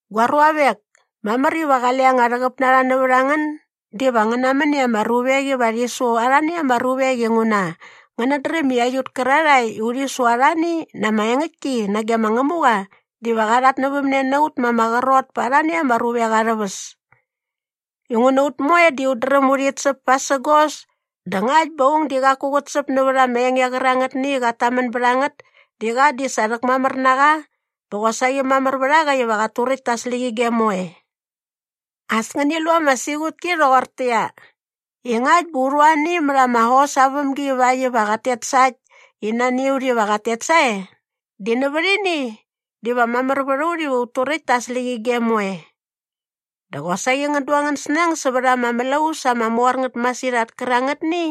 Gua ruavek, mamär iva qale anga rhäqäp na rha nävät a ngän diva ngän namän i ama ruvek iva rhi su arhani ama ruvek inguna ngänät dräm i aiut kärarhae i urhi su arhani na ama engäktki nage ma Ngämuqa diva qa rhatnävämne na ut ma ama qrot pa arhani ama ruvek arhä väs. Inguna ut moe di ut dräm urhit säp pasägos dä ngakt bä aung di qaku qät säp nävät ama enge qärangätni i qat tamän bät a ngät di qa di sa rhäkmamär na qa bä qosaqi mamär vät a qa iva qat turäkt ta aa släqyige moe. As ngäni lu ama siqutki rhoqortäqyia, i ngakt bä u rhu ani mät ama hos aa vämgi ivakt iva qat tet sa äkt i nani a ut iva qat tet sae di nävät ini diva mamär vät a ut iva ut turäkt ta aa släqyige moe. Dä qosaqi ngän du angän snäng sävät ama mlaus ama mor ngät masirhat kärangätni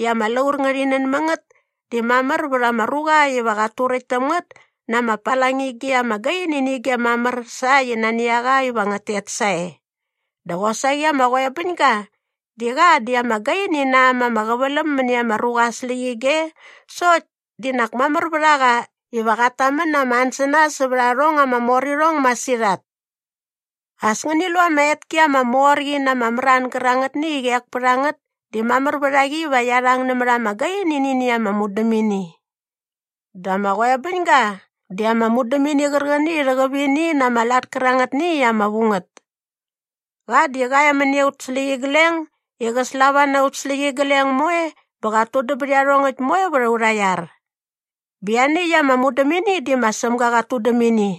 i ama laur ngärhi nän mä ngät di mamär vät ama ruqa iva qat turäkt täm ngät na ama palangige ama gaini nä ige mamär sa äkt i nani a qa iva ngät tet sae. Dä qosaqi ama qoebäñga di qa di ama gaini na äm ama qäväläm mäni ama ruqa aa släqyige sokt di nak mamär vät a qa iva qat tamän na ama ansänas sävät arhong ama mor irhong masirhat. As ngäni lu i ama etki ama mor qi na ama mran gärangätni i qek pät a ngät di mamär vät a qi iva qia rhang nävät ama gaini nä ini ama mudämini! Dä ama qoebäñga di ama mudämini qärqäni i rhäqäp ini na ama lat kärangätni i ama vu ngät. Qa di qa e mäni aut släqyigleng i qä slava na aut släqyigleng moe bä qat tudäm bät iarhongäkt moe vät aurha iar. Bä ianiäkt ama mudämini di ma Sämga qat tudäm ini.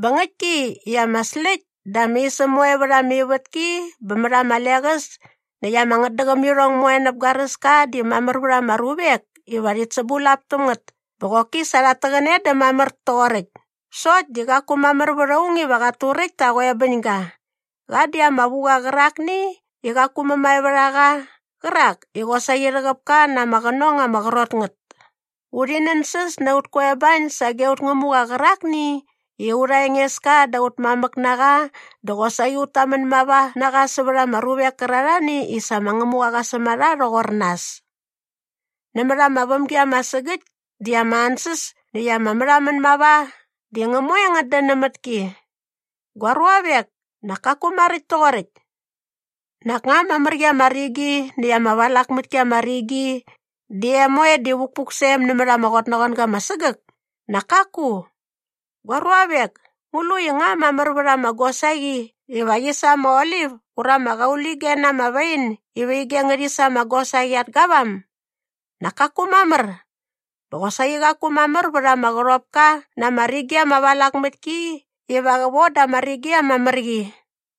Bä ngäktki i ama släkt dä ama isäm moe vät ama ivätki bä mät ama leqäs näkt ama ngätdäqämirhong moe näp garäska di mamär vät ama ruvek iva rhit sämbulap täm ngät bä qoki sa rhat täqäne dä mamär toqoräkt sokt di qaku mamär vät aung iva qat turäkt ta aa qoebäñga. Qa di ama vu qa qärakni i qaku mämae vät a qa qärak i qosaqi rhäqäp ka na ama qänong ama qrot ngät. Urhi nänsäs na aut koebañ sage aut Ngämuqa qärakni i aurha Engeska dä aut mamäk na qa dä qosaqi ut tamän mava na qa sävät ama ruvek kärarhani i sa ma Ngämuqa qa säm a rha rhoqor nas. Nämät ama vämgi ama sägäkt di ama ansäs näkt ama märhamän mava di ngä moe ngät dän nämät ki. Gua ruavek, nak kaku maräkt toqoräkt. Nak nga ama mär qi ama rigi näkt ama valak mät ki ama rigi di em moe di vukpuk sä em nämät ama qotnaqoanga ama sägäk? Nak kaku! Gua ruavek, ngu lu i nga mamär vät ama gosaqi iva qi sa ama olip ura ama qaulige na ama wain iva ige ngärhi sa ama gosaqi at gavam? Nak kaku mamär! Bä qosaqi qaku mamär vät ama qärhopka na ama rigi ama valak mät ki iva qä von da ama mär qi ama rigi.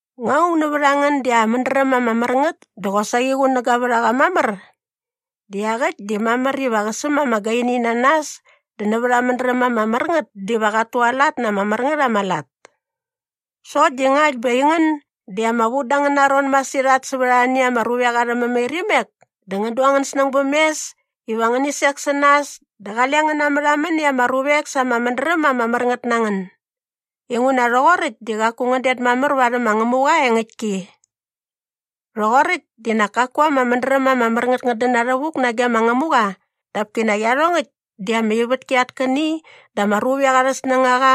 Nga aung nävät a ngän di aa mädräm ama mär ngät dä qosaqi qunäga vät a qa mamär? Di iaqäkt di mamär iva qä säm ama gaini na nas dä nävät aa mädräm ama mär ngät diva qat tualat na ama mär ngät ama lat. Sokt di ngakt bä aingän di ama vu da angäna ron masirhat sävät arhani ama ruvek arhä mämairimek dä ngän du angän snäng bäm mes iva ngäni sek sä nas dä qale ngän namärhamän i ama ruvek sa ama mädräm ama mär ngät na ngän. Inguna rhoqoräkt di qaku ngän det mamär varhäm ma Ngämuqa aa engäktki. Rhoqoräkt di nak kaku ama mädräm ama mär ngät i ngät dän na rhävuk nage ma Ngämuqa dap kinak iarhongäkt di ama ivätki at käni dä ama ruvek arhä snängaqa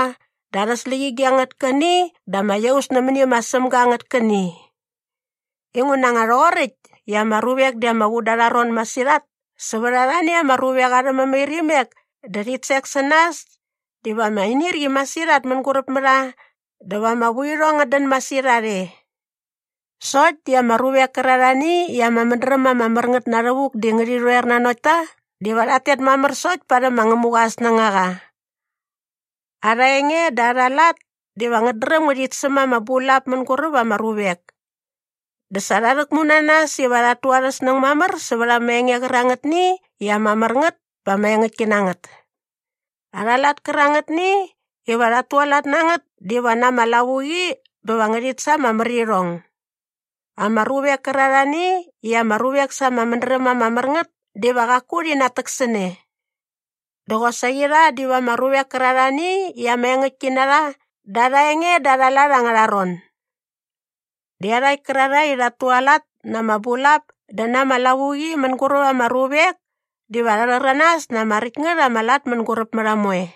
dä arhä släqyige angät käni dä ama iaus nämäni ma Sämga angät käni. Inguna nga rhoqoräkt i ama ruvek di ama vu da arha ron masirhat sävät arhani ama ruvek arha mämairimek dä rhit sek sä nas diva ama inirqi masirhat mänguräp mä rha dä va ama vuirhong ngät dän masirhat e. Sokt di ama ruvek kärarhani i ama mädräm ama mär ngät na rhävuk di ngärhi rhoer nanokt ta diva rhat tet mamär sokt parhäm ma Ngämuqa aa snängaqa. Arha enge dä arha lat diva ngät dräm ngärhit säm ama bulap mänguräp ama ruvek. Dä sa rha rhäkmu na nas iva rhat tu arhä snäng mamär sävät ama enge qärangätni i ama mär ngät bä ama engäktki na ngät. Arha lat kärangätni iva rhat tualat na ngät diva na ama lavuqi bä va ngärhit sa ama märirhong. Ama ruvek kärarhani i ama ruvek sa ama mädräm ama mär ngät diva qaku rhi natäksäne. Dä qosaqi rha diva ama ruvek kärarhani i ama engäktki na rha da arha enge dä arha lat angärha ron. Dä iarhakt kärarhae i rhat tualat na ama bulap dä na ama lavuqi mänguräp ama ruvek diva rha rhäranas na ama räkt ngät ama lat mänguräp mä rha moe.